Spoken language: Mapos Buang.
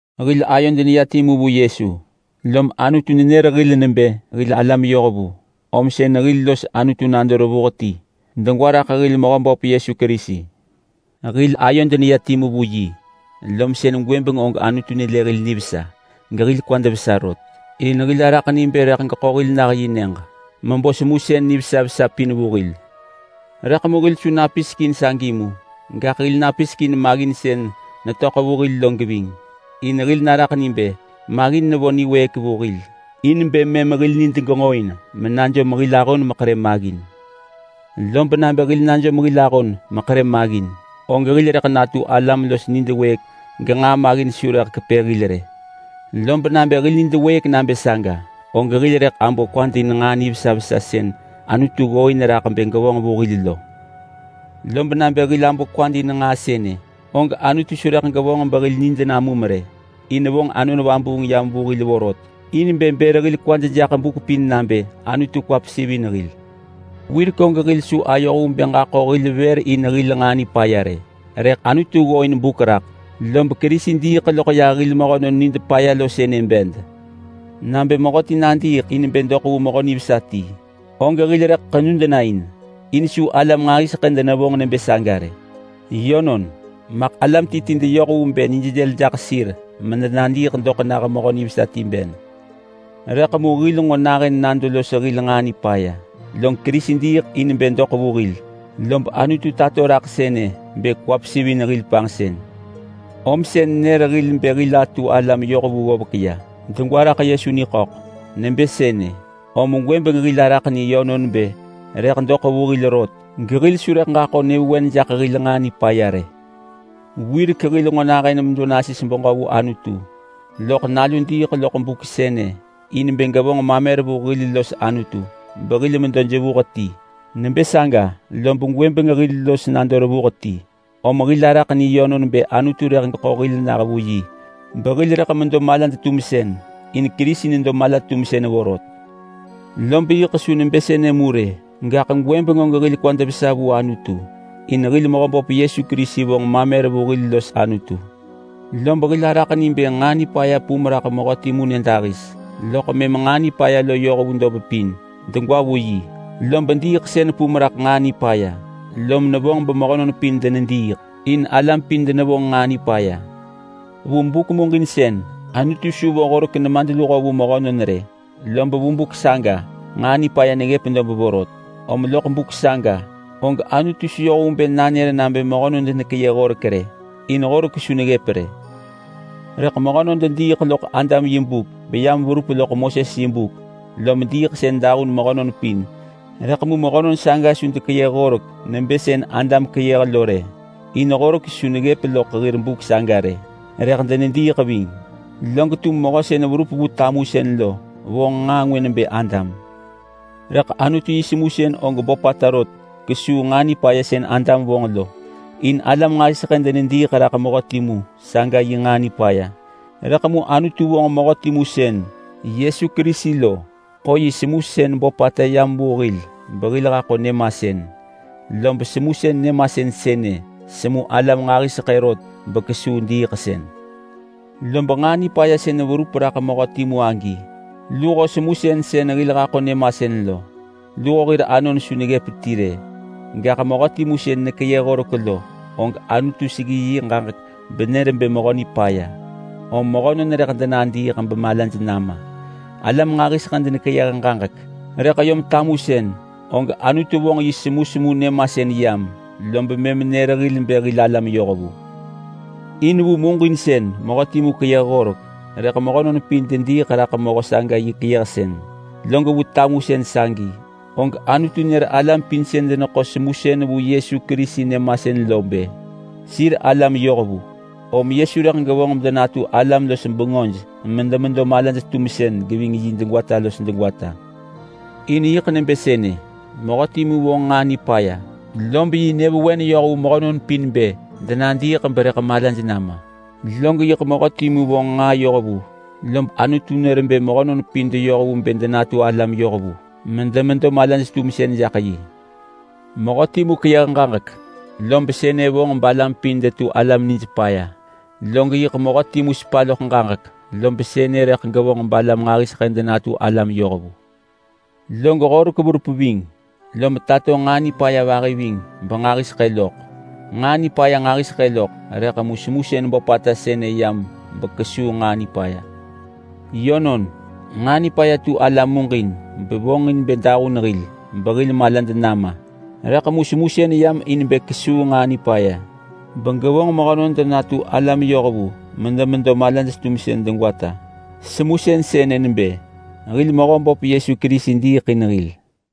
Hil ayod neya timu vu Yesu lom Anutu nenër hil nebë hil alam yohvu, om sën hil los Anutu nado revuh ti degwa raḳ hil Mehöböp Yesu Kerisi. Hil ayod neya timu vu yi, lom sën gwëbeng og Anutu nelë hil nivesa gehil kwad vesa rot, in hil araḳ ni bë rëḳ geḳo hil nah yi nyëġ mebo semusën nivesa vesa pin vu hil. Rëḳ mu hil su napisek in sagi mu. Gaḳ hil napisek in maggin sën netöḳ vu hil lo geving. In hil naraḳ ni bë maggin nevo niwëëk vu hil in bë mëm hil nid genġoin menajom hil ahon mekerë maggin. Lob nabë hil najom hil ahon meḳerë maggin, og hil rëḳ natu alam los nid wëëk genġaa maggin su rëḳ kepë hil rë. Lob nabë hil nid wëëk nabë saga, og hil rëḳ abo kwad in nġaa nivesa vesa sën Anutu ggooin raḳ bë gevonġ vu hil lo. Lob nabë hil abo kwad in nġaa sënë, og Anutu su rëḳ gevonġ behil nid namum rë, in vonġ Anon Vabuung yam vu hil vorot, in bë bër hil kwad jaḳ buk pin nabë Anutu kwa pesivin hil. Wirek og hil su ayoh vu bë ġaḳo hil vër in hil nġaa nipaya rë, rëḳ Anutu ggooin buk raḳ, lob Kerisi diiḳ loḳ yah hil mehönon nid paya lo sënë bed. Nabë mehöti nadiiḳ in bë doḳ vu mehö nivesa ti, og hil rëḳ ḳenud na in, in su alam nġahiseḳë denevonġ nebë saga rë. Yönon, maḳ alam ti ti deyoh vu bë nij dël jaḳ sir medenadiiḳ doḳ nah mehö nivesa ti ben. Rëḳ mu hil nġo nahën nado los hil nġaa nipaya, log Kerisi diiḳ in bë doḳ vu hil. Lob Anutu tato raḳ sënë bë kwa pesivin hil panġsën. Om sën nër hil bë hil atu alam yohvu ggovek ya, degwa raḳ Yesu niḳöḳ. Nebë sënë, om gwëbeng hil araḳ ni yönon bë rëḳ doḳ vu hil rot gehil su rëḳ ġaḳo nyëvewen jaḳ hil nġaa nipaya rë. Wirek hil nġo nahën medo nasis beġö vu Anutu, loḳ Nalu diiḳ loḳ buk sënë in bë gevonġ mamer vu hil los Anutu behil medo jevuh ti. Nebë saga lob gwëbeng hil los nado revuh ti, om hil araḳ ni yönon bë Anutu rëḳ geḳo hil nah vu yi behil rëḳ medo malad-tumsën, in Kerisi nedo mala-tumsën vorot. Lob yiḳ su nebë sënë mu rë, gaḳ gwëbeng og hil kwad vesa vu Anutu in hil Mehöböp Yesu Kerisi vonġ mamer vu hil los Anutu. Lob hil araḳ ni bë nġaa nipaya pum raḳ mehö timu nyëdahis, loḳ mëm nġaa nipaya lo yoh vu dob pin yiḳ degwa raḳ yi. Log diiḳsën pum raḳ nġaa nipaya, lob nevonġ bemehönon pin denediiḳ. In alam pin denevonġ nġaa nipaya. Vu buk muġinsën Anutu su vo Horek-nemadluho vu mehönon rë, lob vu buk saga nġaa nipaya neggëp dob vorot. Om loḳ buk saga og Anutu su yoh vu bë nanër nabë mehönon denekeyëh horek rë, in Horek su neggëp rë. Rëḳ mehönon dediiḳ loḳ Adam yi buk beyam verup loḳ Moses yi buk. Lob diiḳsën dahun mehönon pin. Rëḳ mu mehönon saga su dekeyëh horek nebë sën Adam keyëh lo rë, in Horek su neggëp loḳ hir buk saga rë. Rëḳ denediiḳ ving. Lob yiḳ mehö sën verup vu tamusën lo vonġ nġaa ngwë nebë Adam. Rëḳ Anutu yi semusën og böpata rot kesuu nġaa nipaya sën Adam vonġ lo. In alam nġahiseḳë denediiḳ raḳ mehö timu saga yi nġaa nipaya, rëḳ mu Anutu vonġ mehö timu sën Yesu Kerisi beḳo yi semusën böpata yam vu hil behil haḳo nyëmasën. Lob semusën nyëmasën sënë semu alam nġahiseḳë rot bekesuu diiḳsën. Lob nġaa nipaya sën verup raḳ mehö timu agi luho semusën sën hil haḳo nyëmasën lo, luho hir anon su neggëp ti rë. Gaḳ mehö timu sën nekeyëh horek lo, og Anutu seggi yi ġaġek benër bë mehö nipaya om mehönon rëḳ denadiiḳ bemalaj nama. Rëḳ vu tamusën galam nġahiseḳë denekeyëh ġaġek, og Anutu vonġ yi semusemu nyëmasën yam, lob mëm nër hil bë hil alam yohvu. In vu muġinsën mehö timu keyëh horek, rëḳ mehönon pin dediiḳ raḳ mehö saga yi keyëhsën. Log vu tamusën sagi, og Anutu nër alam pin sën deneḳo semusën vu Yesu Kerisi nyëmasën lo nebë sir alam yohvu. Om Yesu rëḳ gevonġ bedenatu alam-los-bengöj medemedo malaj-tumsën geving yi degwata los degwata. In yiḳ nebë sënë. Mehö timu vonġ nġaa nipaya, lob yi nyëvewen yoh vu mehönon pin bë denadiiḳ berëḳ malaj nama. Log yiḳ mehö timu vonġ nġaa yohvu, lob Anutu nër bë mehönon pin deyoh vu bë denatu alam yohvu medemedo malaj-tumsën jaḳ yi. Mehö timu keyëh ġaġek, lob sënë vonġ balam pin detu alam nij paya. Log yiḳ mehö timu sepa loḳ ġaġek, lob sënë rëḳ gevonġ balam nġahiseḳë denatu alam yohvu. Log Horek verup ving, lom tato nġaa nipaya vahi ving benġahiseḳë loḳ. Nġaa nipaya nġahiseḳë loḳ, rëḳ mu semusën böpata sënë yam bekesuu nġaa nipaya. Yönon, nġaa nipaya tu ala muġin bevonġin bë dahun hil behil malad nama. Rëḳ mu semusën yam in bë kesuu nġaa nipaya begevonġ mehönon medenatu alam yohvu medemedo malaj-tumsën degwata. Semusën sënë nebë hil Mehöböp Yesu Kerisi diiḳ in hil.